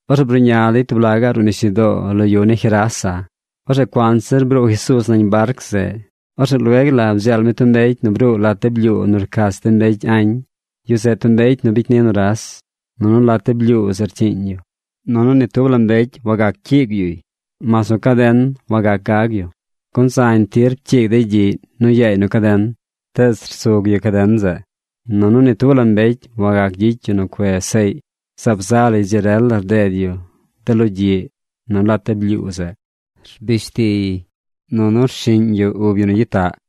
Orzeꞌ bruꞌña dey tub laꞌ gaꞌ ruꞌ nisyudoo lo yu ni Gerasa. Orzeꞌ cuanzir nu bruu Jesuuz nañ barc zeꞌ, orzeꞌ lueg la bdzeel mi tub mbecy nu bruu lat de blyuu nu rcach de mbecy añ. Yu zeꞌ tub mbecy nu bicy ni nuras. Nunu lat de blyuu zeꞌ rcyiiñ yu. Nunu ni tub la mbecy wagac cyiig yuy. Mas nu caden wagac gag yu, gun zañ tir pcyiig dey gyiꞌy nu yaay nu caden. Tees rsug yu caden zeꞌ. Nunu ni tub la mbecy wagac gyicy yu nu cuez seꞌy. Zaab za lay dzi rel la rded yu de logyiꞌ nu lat de blyuu zeꞌ. Rbish tiy, nunu rshiꞌñ yu ub yu nu gyitaꞌ.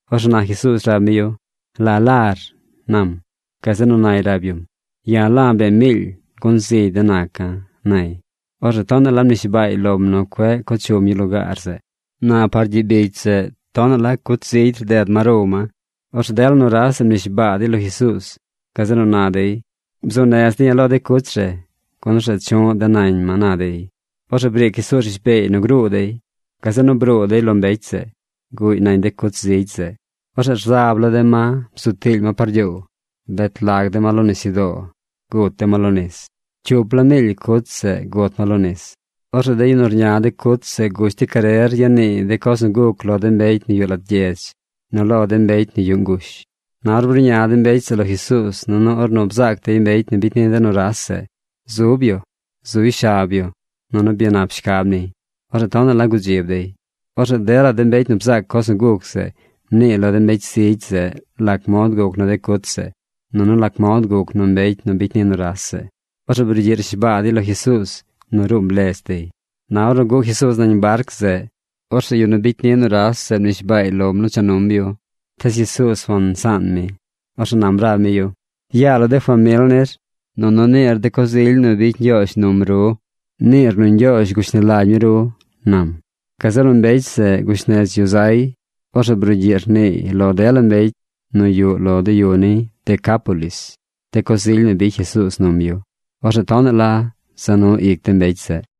Orzeꞌ na Jesuuz rab mi yu: ―¿La lar? ―nam. Gazeꞌ nu nay rab yum: ―Ya̱ la̱ bee miily gun zigy de̱ naca̱ ―nay. Orzeꞌ tonaꞌ mnishbaay lom nu cueꞌ co chum yu lugaar zeꞌ. Na par gyiꞌ bicy zeꞌ tonaꞌ la cuch zigy rded ma row ma. Orzeꞌ dela nuras zeꞌ mnishbaa dey lo Jesuuz. Gazeꞌ nu na dey: ―Bzuu nez de̱ ya̱ lo de cuch re gun orzeꞌ chu̱ꞌ de̱ nañ ma ―na dey. Orzeꞌ briic Jesuuz rishbeey nu gruu dey. Gazeꞌ nu bruu dey lo mbecy zeꞌ. Guꞌy nañ de cuch zigy zeꞌ. Orzeꞌ rzab la de ma bzu tiily ma par gyoow. Bet lag de ma lo nisyudoo. Gut de ma lo nis. Cyup la miily cuch zeꞌ gut ma lo nis. Orzeꞌ de yu nu rña de cuch zeꞌ gush dey carer ya niiy de coz nu guc lo de mbecy nu yuꞌ lat gyedz nu lo de mbecy nu yuꞌ ngush. Na ornu bruꞌña de mbecy zeꞌ lo Jesuuz nunu ornu bzaac dey mbecy nu bicy ni de nuras zeꞌ, zub yu, zuy shab yu, nunu byanap shcab niy, orzeꞌ tonaꞌ la gudzib dey. Orzeꞌ dela de mbecy nu bzaac coz nu guc zeꞌ mniiy lo de mbecy zigy zeꞌ lac mod guc nu de cuch zeꞌ nunu lac mod guc nu mbecy nu bicy ni nuras zeꞌ. Orzeꞌ brugyiꞌ rnishbaa dey lo Jesuuz nu ruum ledz dey. Na ornu guꞌ Jesuuz nañ barc zeꞌ, orzeꞌ yu nu bicy ni nuras zeꞌ mnishbaay lom nu cha num yu. Tees Jesuuz wansaan mi. Orzeꞌ nam rab mi yu: ―Yaa lo de famil nir nunu niir de coz ily nu bicy Ñgyoozh num ru. Niir nu Ñgyoozh gushni lagy mi ru ―nam. Gazeꞌ nu mbecy zeꞌ gush nez yu zay. Orzeꞌ brugyiꞌ rniiy lo dela mbecy nu yuꞌ lo de yu ni Decápolis de coz ily nu bicy Jesuuz num yu. Orzeꞌ tonaꞌ la za nu ic de mbecy zeꞌ.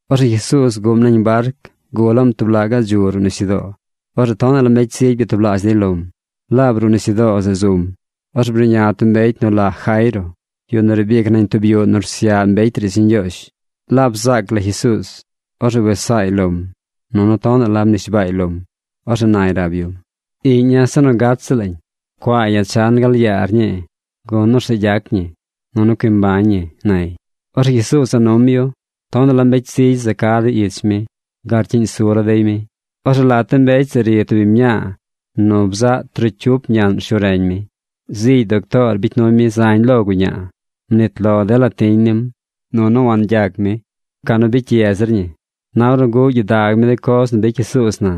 Orzeꞌ Jesuuz guꞌm nañ barc gulaꞌm tub laꞌ gaꞌ dzu ruꞌ nisyudoo. Orzeꞌ tonaꞌ la mbecy zigy byatublaazh dey lom. Laab ruꞌ nisyudoo zeꞌ zum. Orzeꞌ bruꞌña tub mbecy nu la Jairo, yu nu riib ic nañ tub yuꞌ nu rsyaꞌ mbecy riidz ni Ñgyoozh. Laab bzaac lay Jesuuz, orzeꞌ wes saay lom. Nunu tonaꞌ la mnishbaay lom. Orzeꞌ nay rab yum: ―Iꞌña̱ se nu gat ziꞌl lañ. Cua̱a̱ ya̱ chan gal yaar ñii gun, orzeꞌ gyac ñi, nunu cui mbañ ñi ―nay. Orzeꞌ Jesuuz za num yu. Tonaꞌ la mbecy zigy za ca dey ich mi gal rcyiꞌñ su la dey mi. Orzeꞌ lat de mbecy zeꞌ ri tub biñ mñaa nu bzaꞌ trocyup ñaꞌn rshu reñ mi. Zigy doctoor bicy nuy mi zañ lo guñaa. Mnit lo dela tiñ nim, nunu wangyac mi. Ca nu bicy ye zir ñi. Na ornu guꞌ gyidag mi de coz nu bicy Jesuuz na,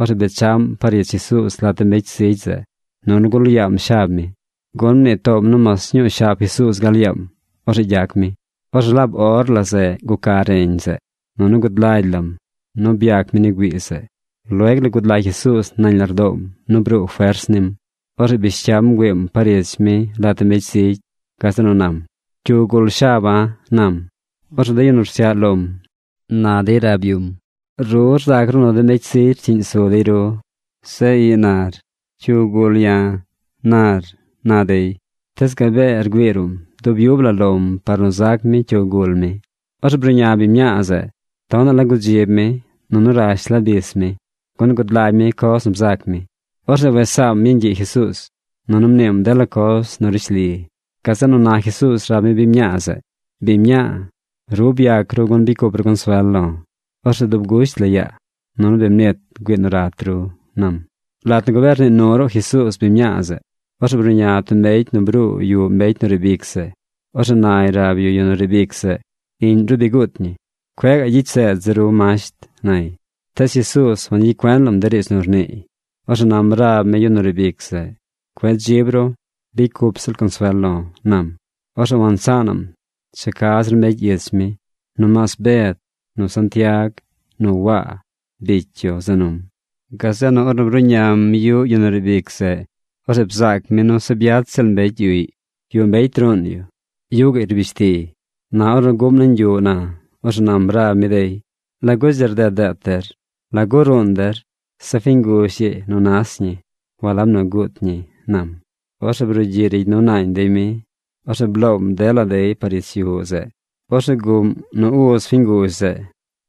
orzeꞌ bechaꞌm par ich Jesuuz lat de mbecy zigy zeꞌ, nunu gul yaam shab mi. Gun mnii toom nu mas ñuu shab Jesuuz gal yaam, orzeꞌ gyac mi. Orzeꞌ laab or la zeꞌ guca reñ zeꞌ, nunu gud lagy lam nu byac mi ni güii zeꞌ. Lueg la gud lagy Jesuuz nañ lardoom nu bruu fers nim. Orzeꞌ bish cyam bgüiim par ich mi lat de mbecy zigy. Gazeꞌ nu nam: ―¿Cyu gul shaba̱? ―nam. Orzeꞌ de yu nu rsyaꞌ lom na dey rab yum: ―Ru rzac ru nu de mbecy zigy rcyiꞌñ su dey ru. Zeꞌ ii nar: “¿Cyu gul ya̱?” nar ―na dey. Tees gabee rgüii ruꞌm dub yub la lom par nu zac mi cyu gul mi. Orzeꞌ bruꞌña biñ mñaa zeꞌ. Tonaꞌ la gudzib mi, nunu rash la bis mi, gun gud lagy mi coz nu bzac mi. Orzeꞌ wes saam yeñ gyiꞌ Jesuuz, nunu mniim dela coz nu rishli. Gazeꞌ nu na Jesuuz rab mi biñ mñaa zeꞌ: ―Biñ mñaa, ru byac ru gun bicy cup ru consuel lo̱. Orzeꞌ dub gusht la yaa, nunu bi mnit güii nu rat ru ―nam. Lat nu gabee rnii nu ruꞌ Jesuuz biñ mñaa zeꞌ, orzeꞌ bruꞌña tub mbecy nu bruu yuꞌ mbecy nu riib ic zeꞌ. Orzeꞌ nay rab yu yu nu riib ic zeꞌ: ―Iꞌñ ru bi guut ñi. Cueꞌ gaꞌ gyicy seed zir ru Masht ―nay. Tees Jesuuz wangyicy cuen lam de riidz nu rniiy. Orzeꞌ nam rab mi yu nu riib ic zeꞌ: ―Cueꞌ dzib ru. Bicy cup ziꞌl consuel lo̱ ―nam. Orzeꞌ wansaanaꞌm cha ca zir mbecy ich mi nomaas Bed, nu Santiag, nu Waa, bicy yu za num. Gazeꞌ nu ornu bruꞌñam yuꞌ yu nu riib ic zeꞌ, orzeꞌ bzaac mi nu se byach ziꞌl mbecy yuꞌy. Yuꞌ mbecy ruun yu. Yuꞌ gaꞌy rbish tiy. Na ornu guꞌm nañ yuꞌ na, orzeꞌ nam rab mi dey: ―¿Lagu dzi rded deet der? ¿Lagu ruun der? Zeꞌ fiñ nguzh ii nu nas ñi; walab nu guut ñi ―nam. Orzeꞌ brugyiꞌ rigy nu naañ dey mi. Orzeꞌ bloom dela dey par ich yuꞌ zeꞌ. Orzeꞌ guꞌm nu uz fiñ nguzh zeꞌ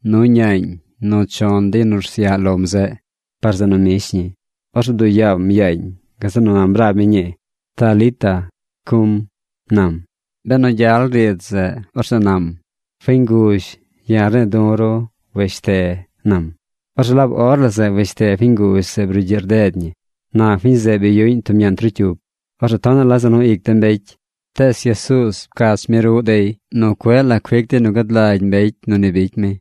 nu ñaañ nu chon de yu nu rsyaꞌ lom zeꞌ par zeꞌ nu mbish ñi. Orzeꞌ bduꞌ yaam yaañ. Gazeꞌ nu nam rab mi ñii: ―Talita cum ―nam. Benu gyal riidz zeꞌ, orzeꞌ nam: Fiñ nguzh, ya̱ rne̱e̱ du̱ ru weshte, nam. Orzeꞌ laab or la zeꞌ weshte fiñ nguzh zeꞌ brugyiꞌ rded ñi. Na fiñ zeꞌ bi yuꞌñ tub ñaꞌn trocyup. Orzeꞌ tonaꞌ la za nu ic de mbecy. Tees Jesuuz pcach mi ruꞌ dey nu cueꞌ la cuic dey nu gad lagy mbecy nu ni bicy mi.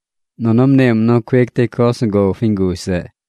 Nunu mniim nu cuic dey coz nu gow fiñ nguzh zeꞌ.